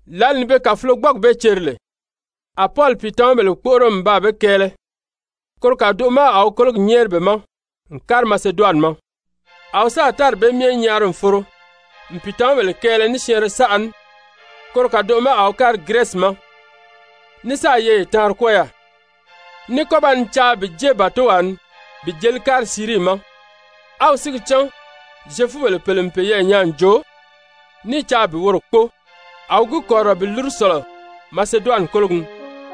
Lǎli ni be kàfulogbɔɔgi bee ceri lè, a Pɔli pìitamabèle kpóʔoro n baa be kɛɛlɛ, koro kàdoʔo ma a wi kólogi nyɛ́ɛri be ma n kári Maseduwani ma. A wi sáà tári bee myɛ nyaari n foro n pìitamabèle kɛɛlɛ ní syɛɛnrɛ saʔa ní, koro kàdoʔo ma a wi kári Girɛsi ma. Ní sáà yeye taanri kwɔ́ɔ yaà, ní kɔ́ ba ni caa bi jée bàtowaa ni bi jeli kári Sirii ma. A wi si gi cán Zyefubèle pèle n peyɛɛ nyaa n joo ní i caa bi woro kpóo, a wi gi kɔ̀rirɔ bi lúru sɔ̀lɔ Maseduwani kólogi ni.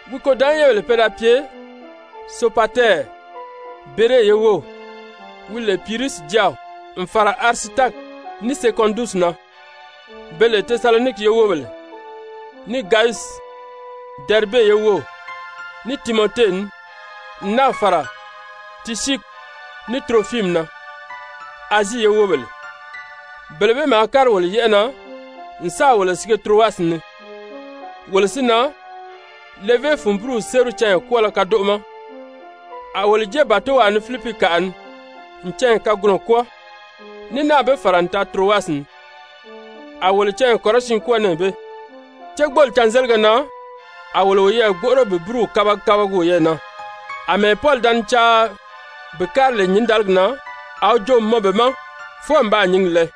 Wi kôdanʔanyɛnbèle pe da pye Sopatɛri, Bere ye wów, wi lè Pirusi jáaw, n fàra Arisitaki, ní Sekɔndusi na, be lè Tesaloniki ye wóbèle, ní Gayusi, Dɛribe ye wów, ní Timɔte ní, n náà fàra Tisyiki ní Turofimi na, Azii ye wóbèle. Bele bee maa kári wolo yɛ́ʔɛ na n sáà wolo sige Turowasi ni. Wolo si na, levé fun búruw séri canya kwɔ́ɔlɔ kadoʔo ma, a wolo jée bàtowaa ni Filipikaʔa ni n canya kagunɔ kwɔ́ɔ, ní náà be fàra n taa Turowasi ni, a wolo canya kɔrɔsiin kwɔ́ɔ nɛɛ bee. Cégbooli cânzélige na a wolo woyɛɛ gbóʔoro bi búruw kabagi kabagi woyɛɛ na. Amɛɛ Pɔli da ni caa bi kári lè ki nyǐndaligi na, a wi joo n mɔn be ma fwɔɔ n baa nyǐngi lɛɛ.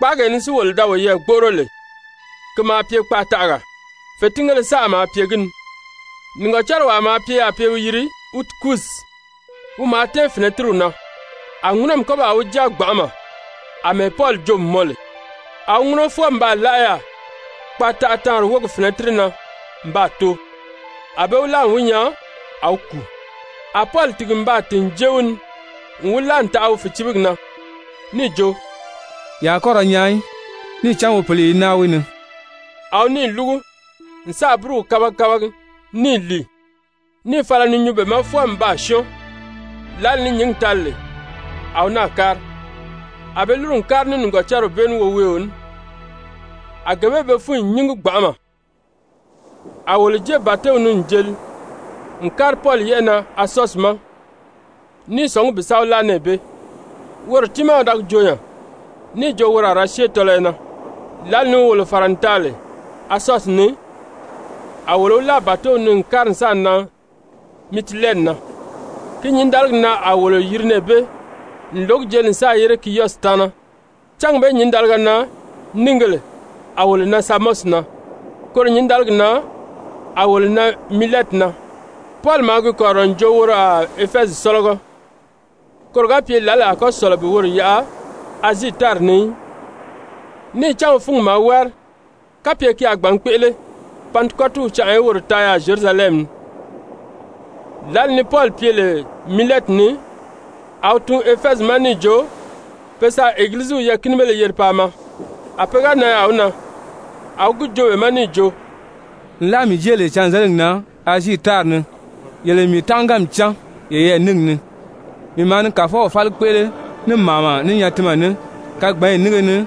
Kpáagee ni si wolo da woyɛɛ gbóʔoro lè, ki maa pye kpaataʔagaa, fètingéle saʔa maa pye gi ni. Nìgɔcariwaa maa pye yaà pe i wi yiri Utikusi, wi maa tɛ́ɛn fɛ̀nɛtiriw na, a ŋúnɔmi kɔ́ baa wi jáa gbanʔama àmɛɛ Pɔli joo n mɔn lè. A wi ŋúnɔ fwɔɔ n baa láʔa yaà kpaataʔa-taanri wógi fɛ̀nɛtiri na n baa too. A be wi láa n wi nyaa a wi kùu. A Pɔli tìgi n baa tìn n jée wi ni n wi láa n taʔa wi fìcibigi na níì jo: «Ye a kɔ́ ra nyaan í, níì cán wi pǐli i naa wi ni.» A wi níì lúgu n sáà búruw kabagi kabagi níì lìi, níì fala ni nyuu be ma fwɔɔ n baa syɔ́ɔn. Lǎli ni nyǐngi tali lè, a wi náà kári. A be lúru n kári ní nìgɔcariw bee ní woweeo ní, a gee bee be fúnyi nyíngi gbanʔama. A wolo jée bàtow ni n jeli n kári Pɔli yɛ́ʔɛ na Asɔsi ma ní i sɔ̀ngí bi sa wi láa nɛɛ bee, woro tiimaa wi da gi joo nya, níì jo woro a ra syée tɔlɔyɔ na. Lǎli ni wi wolo fàra n taa lè Asɔsi ni, a wolo wi láa bàtow ni n kári n sáà nan Mitilɛni na. Ki nyǐndaligi na a wolo yiri nɛɛ bee n lǒgi jeli n sáà yére Kiyɔsi taana. Cángi bee nyǐndaliga na níìgēle a wolo nan Samɔsi na, koro nyǐndaligi na a wolo nan Milɛti na. Pɔli maa gi kɔ̀rirɔ n jo woro a Efɛzi sɔ́lɔgɔ, koro ga pye lǎli a kɔ́ sɔ̀lɔ bi woro yaʔa Azii tári ni í. Níì cán wi fúngi maa wári kapye ki a gbǎn kpéʔele Pantikɔtiw canʔa í woro taa yaà Zyerusalɛmi ni. Lǎli ni Pɔli pye lè Milɛti ni, a wi tun Efɛzi ma níì jo pe sa Egiliziw yɛɛ̀kinibéle yeri paa maa. A pe ga nan yaà wi na, a wi gi joo be ma níì jo: «Nlaa mii jée lè cânzeligi na Azii tári ni yele n mii tánʔaganmi cán yeyɛɛ níngi ni. Mii maa ni Kàfɔw fáli kpéʔele ní màama, ní nyatinmɛ ní, kagbanyi nínge ni,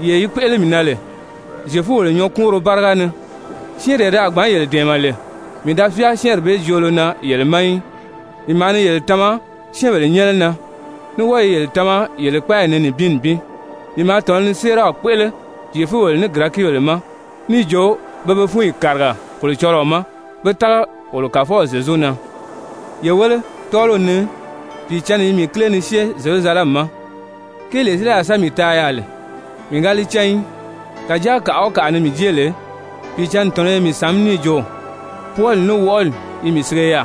yee yi kpéʔele lè mii na Zyefubèle nyɔɔkuunro báriga ni. Syɛ́ɛnree ti a gbǎn yele dɛ̀ɛmɛ lè, mii da fyáa syɛ́ɛnri bee joolo na yele ma í, mii maa ni yele tama syɛ́ɛnbèle nyɛ́nɛ na, ní wɔ́ɔ i yele tama yele kpáayi ni nibin nibin. Mii maa tɔ̀nɔ ni séeraw kpéʔele Zyefubèle ní Girɛkibèle ma níì jo pe be fúnyi kàriga Kolocɔlɔɔ ma, pé tága wolo Kàfɔw Zyezu na. Ye wéle, tɔ́ɔliw ni Pìicǎnni i mii kíle ni syée Zyerusalɛmi ma, kéelee si li a sa mii taa yaà lè mii ga li cán í. Kàjáa kàʔa o kàʔa ni mii jée lè Pìicǎnni tɔ̀nɔ́ i mii sàmí níì jo, pwɔɔli ní wɔʔɔli i mii sige yaà.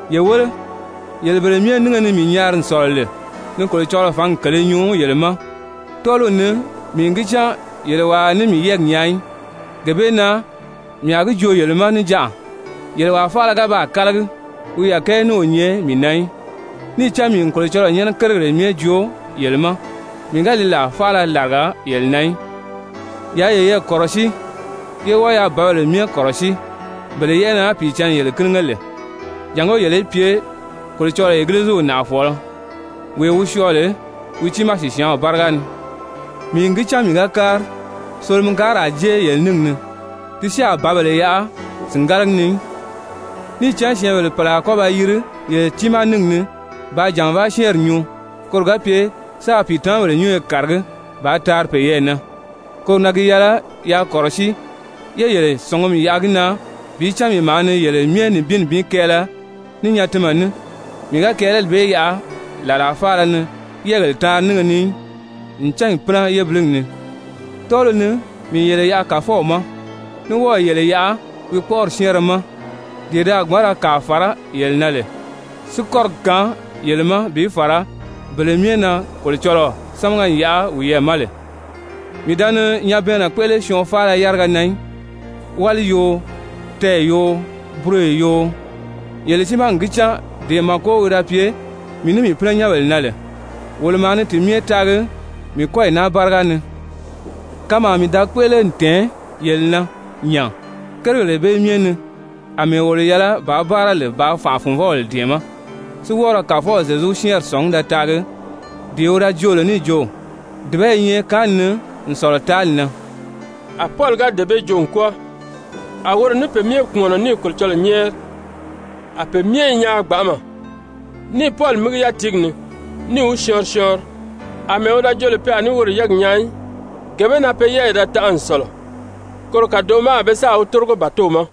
Ye wéle, yele bele myɛ nínge ni mii nyaari n sɔ̀lɔ lè ni Kolocɔlɔɔ fǎngi kèlē nyuu yele ma, tɔ́ɔliw ni mii n gi cán yele wàa a ní mii yɛ́ɛgi nyaa í. Gee bee na mii a gi joo yele ma níjanʔa, yele wàa faala ga baa kálagi, wi yàkɛɛ ní o nyɛ mii na í. Níì cán mii n Kolocɔlɔɔ nyɛ́nɛ kérigèle myɛ joo yele ma, mii ga li làa faala làriga yele na í. Yaa yeyɛɛ kɔ̀rɔsíi, ye wɔ́ɔ yaa bǎbèle myɛ kɔ̀rɔsíi, bele yɛ́ʔɛ na Pìicǎnni yele kínige lè, jàngó yele í pye Kolocɔlɔɔ Egiliziw nàʔafɔɔlɔ, wee wi syɔɔ lè wi tiimaa sìsyaanw báriga ni. Mii n gi cán mii ga kári, solomikaari a jée yele níngi ni, ti si a bǎbèle yaʔa sìngalagi ni í. Níì cán syɛ́ɛnbèle pèle a kɔ́ ba yìri yele tiimaa níngi ni bàā jànvaa syɛ́ɛnri nyuu koro ga pye sáā pìitamabèle nyúnyo kàragí bàā taari peyɛɛ na. Koro na gi yɛlɛ yaa kɔ̀rɔsíi, yé yele sɔ̀ngumi yaʔa gi na bi cán mii maa ni yele myɛ nibin nibin kɛɛlɛ ní nyatinmɛ ní. Mii ga kɛɛlɛli bee yaʔa làlaa faala ni yɛ́ɛgèle taanri nínge ni í, n cányi pínɛ yébiliyi ni. Tɔ́ɔliw ni mii n yele yaʔa Kàfɔw ma, ní wɔ́ɔ̀ yele yaʔa wi kpɔ́ʔɔri syɛ́ɛnrɛ ma, dee ti a gbǎn ra kàa fàrá yele na lè, si kɔ́rigi kaan yele ma bi fàra bele myɛ na Kolocɔlɔɔ sámaga n yaʔa wiyɛɛ ma lè. Mii da ni nyabɛɛnnɛ kpéʔele syɔɔn faala yáriga na í, wáli yoo, tɛɛ̀ yoo, buroyo yoo. Yele tiimaa n gi cán dee màko wi da pye mii ní mii pínɛnyɛnbèle na lè, wolo maa ni ti myɛ taagi mii kɔ́yi naa báriga ni. Kanmaa mii da kpéʔele n tɛ̀ɛn yele na nya kérigèle bee myɛ ni àmɛɛ wolo yɛlɛ bàā báara lè bàā fànʔa-fùnvɔbèle dɛ̀ɛmɛ́, si wɔ́ɔ ra Kàfɔw Zyezu syɛ́ɛnri sɔ̀ngí da taagi dee wi da joo lè níì jo: ‹Dùba i nyɛ kaanni ni n sɔ̀lɔ taali na.›» A Pɔli ga dee bee joo n kwɔ́ɔ, a woro ní pe myɛ kpùmɔnɔ níì Kolocɔlɔɔ nyɛ́ɛri. A pe myɛ i nyaan gbanʔama, níì Pɔli mígi yátiigi ni, níì wi syɔɔnri syɔɔnri. Amɛɛ wi da jo lè pe a ní woro yɛ́ɛgi nyaa í, gee bee na pe yɛ́ɛyi da tanʔa n sɔ̀lɔ. Koro kàdoʔo ma a be sáà wi tórigo bàtow ma.